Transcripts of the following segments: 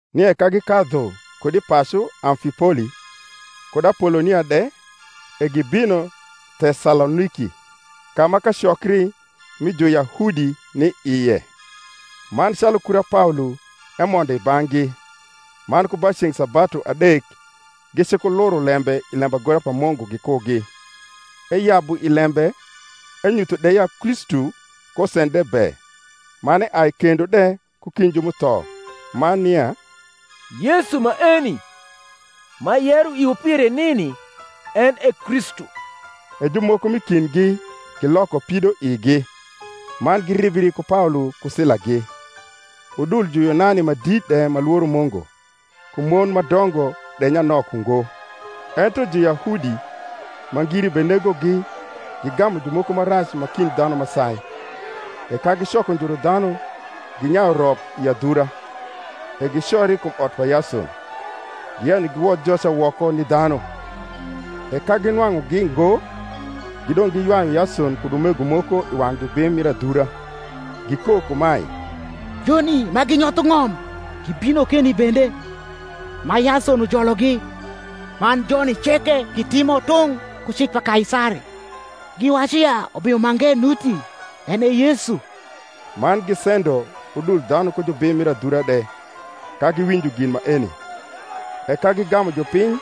Nie ka gikadhu kud i pacu Amlipoli, kud Apolonia de, e gibino Tesaloniki, ka ma kacokri mi Juyahudi ni ie: man calu kura Paolo emondo i bang’gi, man ku ba ceng’ sabatu adek gicikuluro lembe i lembagora pa Mungu gikugi, eyabu i lembe enyutho de ya Kristu kosendre be, man eai kendo de ku kind ju m’utho; man nia Yesu maeni, m’ayero iwu pire nini, en e Kristu. E jumoko m’i kindgi giloko pidoigi, man giribri ku Paolo ku Silagi: udul Juyunani ma dit de ma lworo Mungu, ku mon ma dongo de nyanok ungo. Ento Juyahudi, ma ngiri benegogi, gigamu jumoko ma rac ma kind dhanu ma sai, e ka gicoko njuru dhanu, ginyayu rop i adhura; e gicori kum ot pa Yason, giyenyo giwodh joca woko ni dhanu. E ka ginwang’ugi ngo, gidong’ giywayu Yason kud umego moko i wang’ jubim mir adhura, gikok kumae, Joni ma ginyotho ng’om gibino keni bende, ma Yason ujologi; man joni ceke gitimo tung’ ku cik pa Kaisari, giwacu ya ubimo mange nuti, en e Yesu. Man gisendo udul dhanu ku jubim mir adhura de, ka giwinjo gin maeni. E ka gigamu jupiny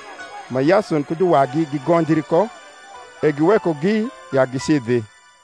ma Yason ku juwagi gigonjri ko, e giwekogi ya gicidhi.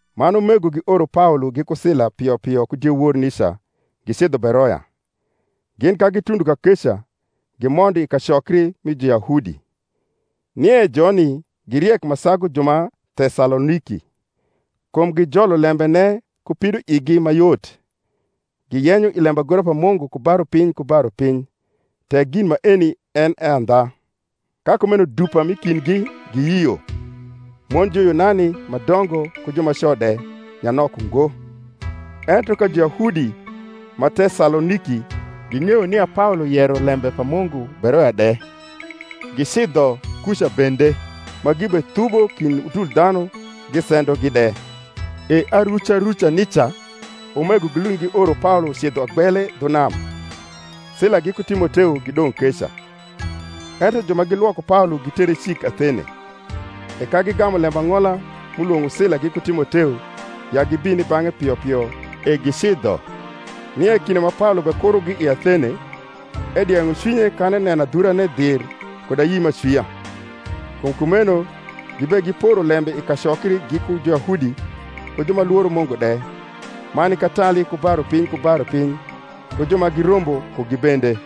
Man umego gioro Paolo giku Sila pio pio ku diewor nica gicidho Beroya: gin ka gitundo kakeca gimondo i kacokri mi Juyahudi. Nie joni gi riek ma sagu ju ma Tesaloniki kum gijolo lembene ku pidoigi ma yot, giyenyo i lembagora pa Mungu ku ba rupiny ku ba rupiny, tek gin maeni en e andha. Ka kumeno dupa m’i kindgi giyio; mon Juyunani ma dongo, ku jumaco de, nyanok ungo. Ento ka Juyahudi ma Tesaloniki ging’eyo nia Paolo yero lembe pa Mungu Beroya de, gicidho kuca bende, ma gibethubo kind udul dhanu gisendogi de. E aruca ruca nica umego gilund gioro Paolo ucidho agbele dhu nam: Sila giku Timoteo gidong’ keca. Ento ju ma gilwoko Paolo gitere cik Athene: e ka gigamu lembang’ola m’ulwong’o Sila giku Timoteo ya gibin i bang’e pio pio, e gicidho. Nie kinde ma Paolo bekurogi i Athene, edieng’o cwinye kan eneno adhurane dhir kud ayi m’acwia. Kum kumeno gibegiporo lembe i kacokri giku Juyahudi ku ju ma lworo Mungu de, man i katali ku ba rupiny ku ba rupiny ku ju ma girombo kugi bende.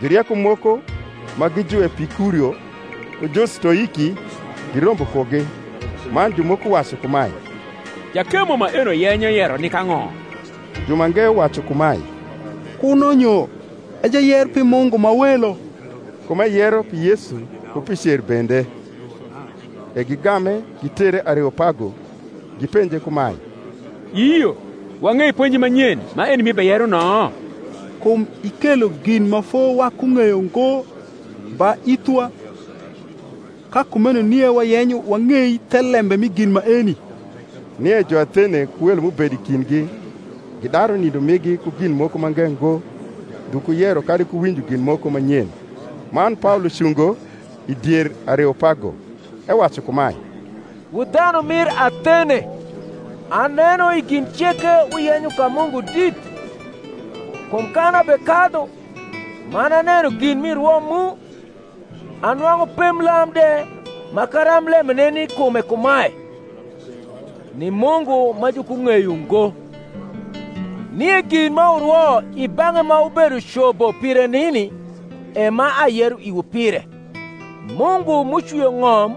Jurieko moko ma gi Juepikurio ku Justoiki girombo kugi. Man jumoko wacu kumae, Jakemo maeno yenyo yero nik ang’o? jumange wacu kumae, Kuno nyo e jayer pi mungu ma welo: kum eyero pi Yesu ku pi cer bende. E gigame, gitere Areopago, gipenje kumae, Iyio wang’ei ponji ma nyen maeni m’ibeyero no? Kum ikelo gin ma fo’wakung’eyo ngo ba ithwa: ka kumeno nie wayenyo wang’ei thelembe mi gin maeni. (Nie Juathene ku welo m’ubedo i kindgi gidaru nindo migi ku gin moko mange ngo, ndhu ku yero kadi ku winjo gin moko ma nyen.) Man Paolo cungo i dier Areopago, ewacu kumae, Wu dhanu mir Athene, aneno i gin ceke wuyenyo ka mungu dit. Kum kan abekadhu, man aneno gin mi rwo mu, anwang’u pemblam de ma karamblembe ni i kume kumae, NI MUNGU MA JUKUNG’EYO NGO. Nie gin ma wurwo i bang’e ma wubedo cobo pire nini, e ma ayero iwu pire. Mungu m’ucwio ng’om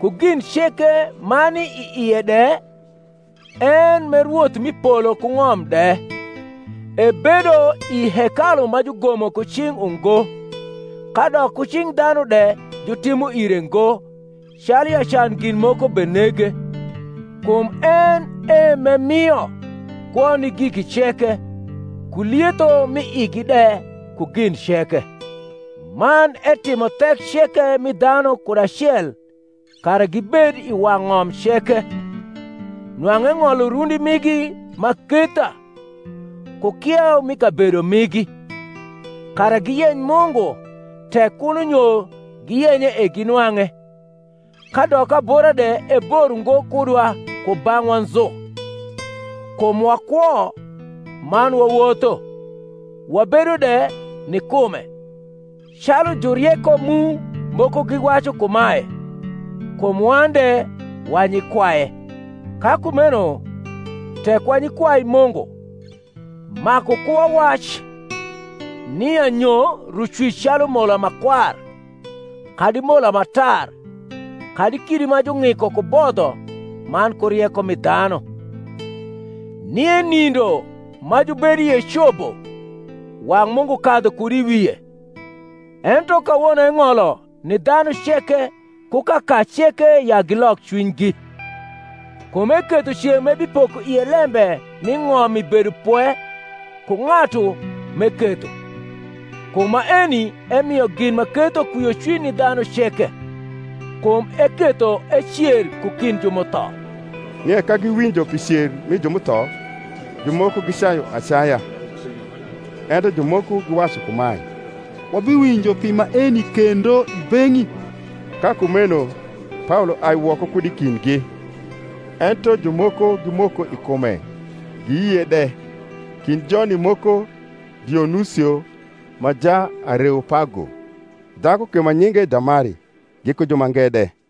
ku gin ceke ma ni i ie de, en, m’e Rwoth mi polo ku ng’om de, ebedo i hekalu ma jugomo ku cing’ ungo; kadok ku cing’ dhanu de jutimo ire ngo, calu ya can gin moko benege, kum en e m’emio kwo ni giki ceke, ku lietho m’i igi de, ku gin ceke; man etimo thek ceke mi dhanu kud acel kara gibed i wang’ ng’om ceke, nwang’u eng’olo rundi migi m’aketha, ku kieu mi kabedo migi; kara giyeny Mungu, tek kuno nyo giyenye e ginwang’e, kadok abora de ebor ungo kudwa kubang’wa nzu: kum wakwo man wawotho, wabedo de ni kume; calu jurieko mu moko giwacu kumae, Kum wan de wa nyikwaye. Ka kumeno tek wa nyikwai Mungu, maku ku wawac nia nyo Rucwic calu mola ma kwar, kadi mola ma tar, kadi kidi ma jung’iko ku bodho man ku rieko mi dhanu. Nie nindo ma jubedo ie cobo, wang’ Mungu kadhu kud i wie; ento kawono eng’olo ni dhanu ceke ku kaka ceke ya gilok cwinygi: kum eketho ceng’ m’ebipoko ie lembe mi ng’om i bedopwe ku ng’atu m’eketho: kum maeni emio gin ma ketho kwiocwiny ni dhanu ceke, kum eketho ecer ku kind ju m’utho. Nie ka giwinjo pi cer mi ju m’utho, jumoko gicayu acaya; ento jumoko giwacu kumae, Wabiwinjo pi maeni kendo i beng’i. Ka kumeno Paolo ai woko kud i kindgi. Ento jumoko gimoko i kume, giyie de: kind joni moko Dionusio ma Jaareopago, dhaku ke ma nyinge Damari, giku jumange de.